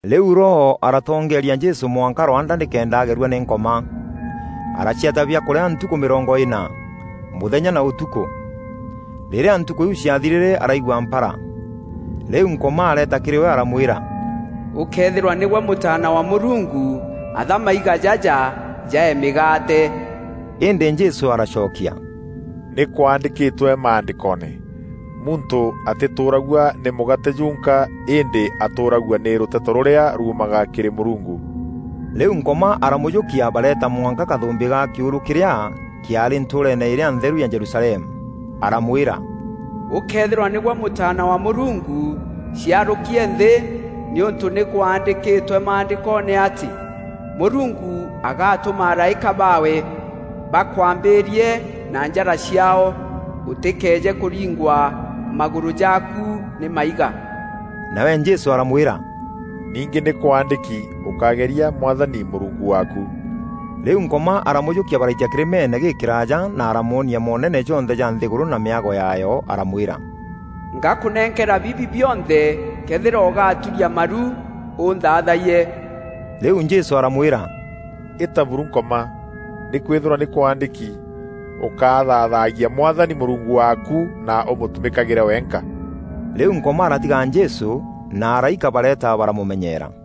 Rîu Roho aratongeeria Jesû mwanka rwanda nîkenda agerua nî Nkoma. Araciata biakûrîa ntukû mîrongo îna, mûthenya na ûtukû. Rîrîa ntukû iu ciathirîre araigua mpara. Rîu Nkoma areeta kîrî we aramwîra, “Ûkëethîrwa nîgwe Mûtaana wa Mûrungu, atha maiga jaja jaee mîgaate.” Îndî Jesû aracokia, “Nî kwandîkîtwe Maandîkoone; ‘Muntû atîtûûragua nî mûgaate junka îndî atûragua nî rûteto rûrîa ruumaga kîrî Mûrungu.’” Rîu Nkoma aramûjûkia bareeta mwanka kathûmbî ga kîûrû kîrîa kîaarî ntûûreene îrîa ntheru ya Jerusalemu, aramwîra, “Ûkëthîrwa nîgwe Mûtaana wa Mûrungu, ciarûkie nthî, nîûntû nî kwaandîkîtwe maandîkoone atî: ‘Mûrungu agatûma araîka baawe, bakûambîîrie na njara ciaao, ûtîkeeje kûringwa magûrû jaaku nî maiga.’” Nawe Jesû aramwîra, “Ningî nî kwaandîki: ‘Ûkágeria Mwathani Mûrungu waaku.’” Rîu Nkoma aramûjûkia baraitia kîrîmeene gîkîraaja na aramwonia moonene jonthe ja nthîgûrû na mîago yaayo aramwîra, “Ngakûnenkera bibi bionthe këethîra ûgaturia maru ûnthathayie.” Rîu Jesû aramwîra, “Îta buru Nkoma! Nîkwîthîrwa nî kwaandîki: ‘Ûkathaathagia Mwathani Mûrungu waaku na ûmûtumîkagîre wenka.’” Rîu Nkoma aratiga Jesû, na araîka bareeta baramûmenyeera.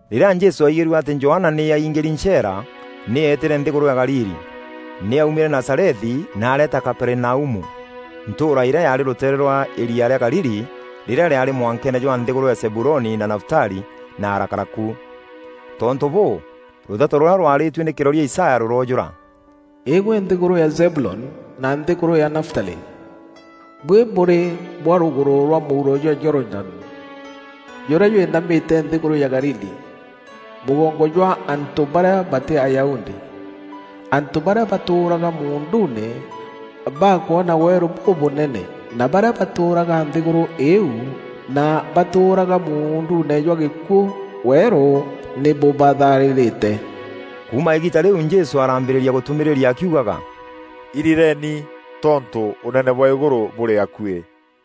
Rîrîa Jesû aigîrue atî Johana nî aingîri ncheera, nî eetîre nthîgûrû ya Galili. Nî aumîre Nazarethi na areeta Kaperinaumu, ntûûra îrîa yaarî rûteere rwa îria rîa Galili rîrîa rîaarî mwankeene jwa nthîgûrû ya Zebuloni na Nafutali na arakara ku. Tontû bûû, rûteto rûrîa rwaarîtue nî kîroria Isaya rûroojûûra: “Îîgwe nthîgûrû ya Zebuloni na nthîgûrû ya Nafutali, buî bûrî bwa rûgûrû rwa mûuro jwa Jorodani, jûrîa jwînamîte nthîgûrû ya Galili, mûgongo jwa antû barîa batî Ayahudi. Antû barîa batûûraga muunduune, bakwona weerû bûbûnene, na barîa batûûraga nthîgûrû îîu na batûûraga muunduune jwa gîkûû, weerû nî bûbatharîrîte.” Kuuma îgiita rîu Jesû arambîrîîria gûtûmîîria akiugaga, “Irireeni, tontû ûnene bwa îgûrû bûrî akuî.”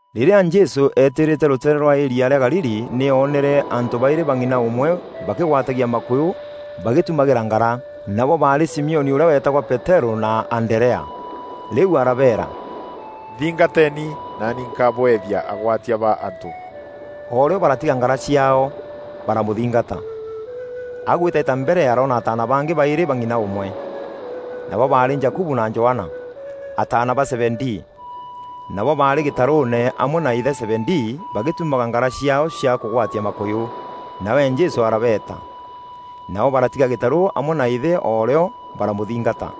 Rîrîa Jesû eetîrîte rûteere rwa îria rîa Galili nî oonere antû baîrî ba ng'ina ûmwe bakîgwatagia makûyû bagîtumagîra ngara. Nabo baarî Simioni ûrîa weetagwa Peterû na Anderea. Rîu arabeera, “Nthîngateni naani nkabweethia agwatia ba antû” O rîo baratiga ngara ciaao, baramûthingata. Agwîtaîta mbere aroona ataana bangî baîrî ba ng'ina ûmwe. Nabo baarî Jakubu na Johana, ataana ba Zebedii. Nabo baarî gîtarûûne amwe na îthe Zebedii bagîtumaga ngara ciaao cia kûgwatia makûyû, nawe Jesû arabeeta. Nabo baratiga gîtarû amwe na îthe o rîo, baramûthingata.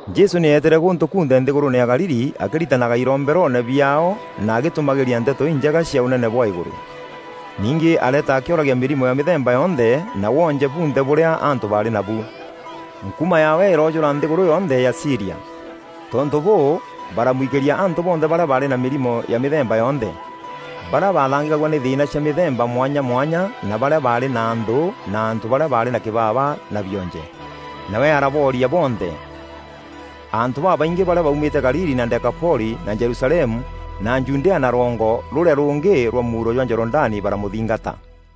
Jesû nî eetîre gûntû kunthe nthîgûrûûne ya Galili akîritanaga iromberoone biaao na agîtûmagîîria Nteto Injega cia ûnene bwa îgûrû. Ningî areeta akîoragia mîrimo ya mîthemba yonthe na woonje bunthe bûrîa antû baarî nabu. Nkuuma yaawe îroojûra nthîgûrû yonthe ya Sîria. Tontû bûû, baramwikîria antû bonthe barîa baarî na mîrimo ya mîthemba yonthe: barîa bathangîkagua nî thîîna cia mîthemba mwanya mwanya na barîa baarî na nthû na antû barîa baarî na kîbaba na bionje. Nawe arabooria bonthe. Antû babaingî barîa baumîte Galili na Dekapoli na Jerusalemu na Judea na rwongo rûrîa rûngî rwa mûuro jwa Jorodani baramûthingata.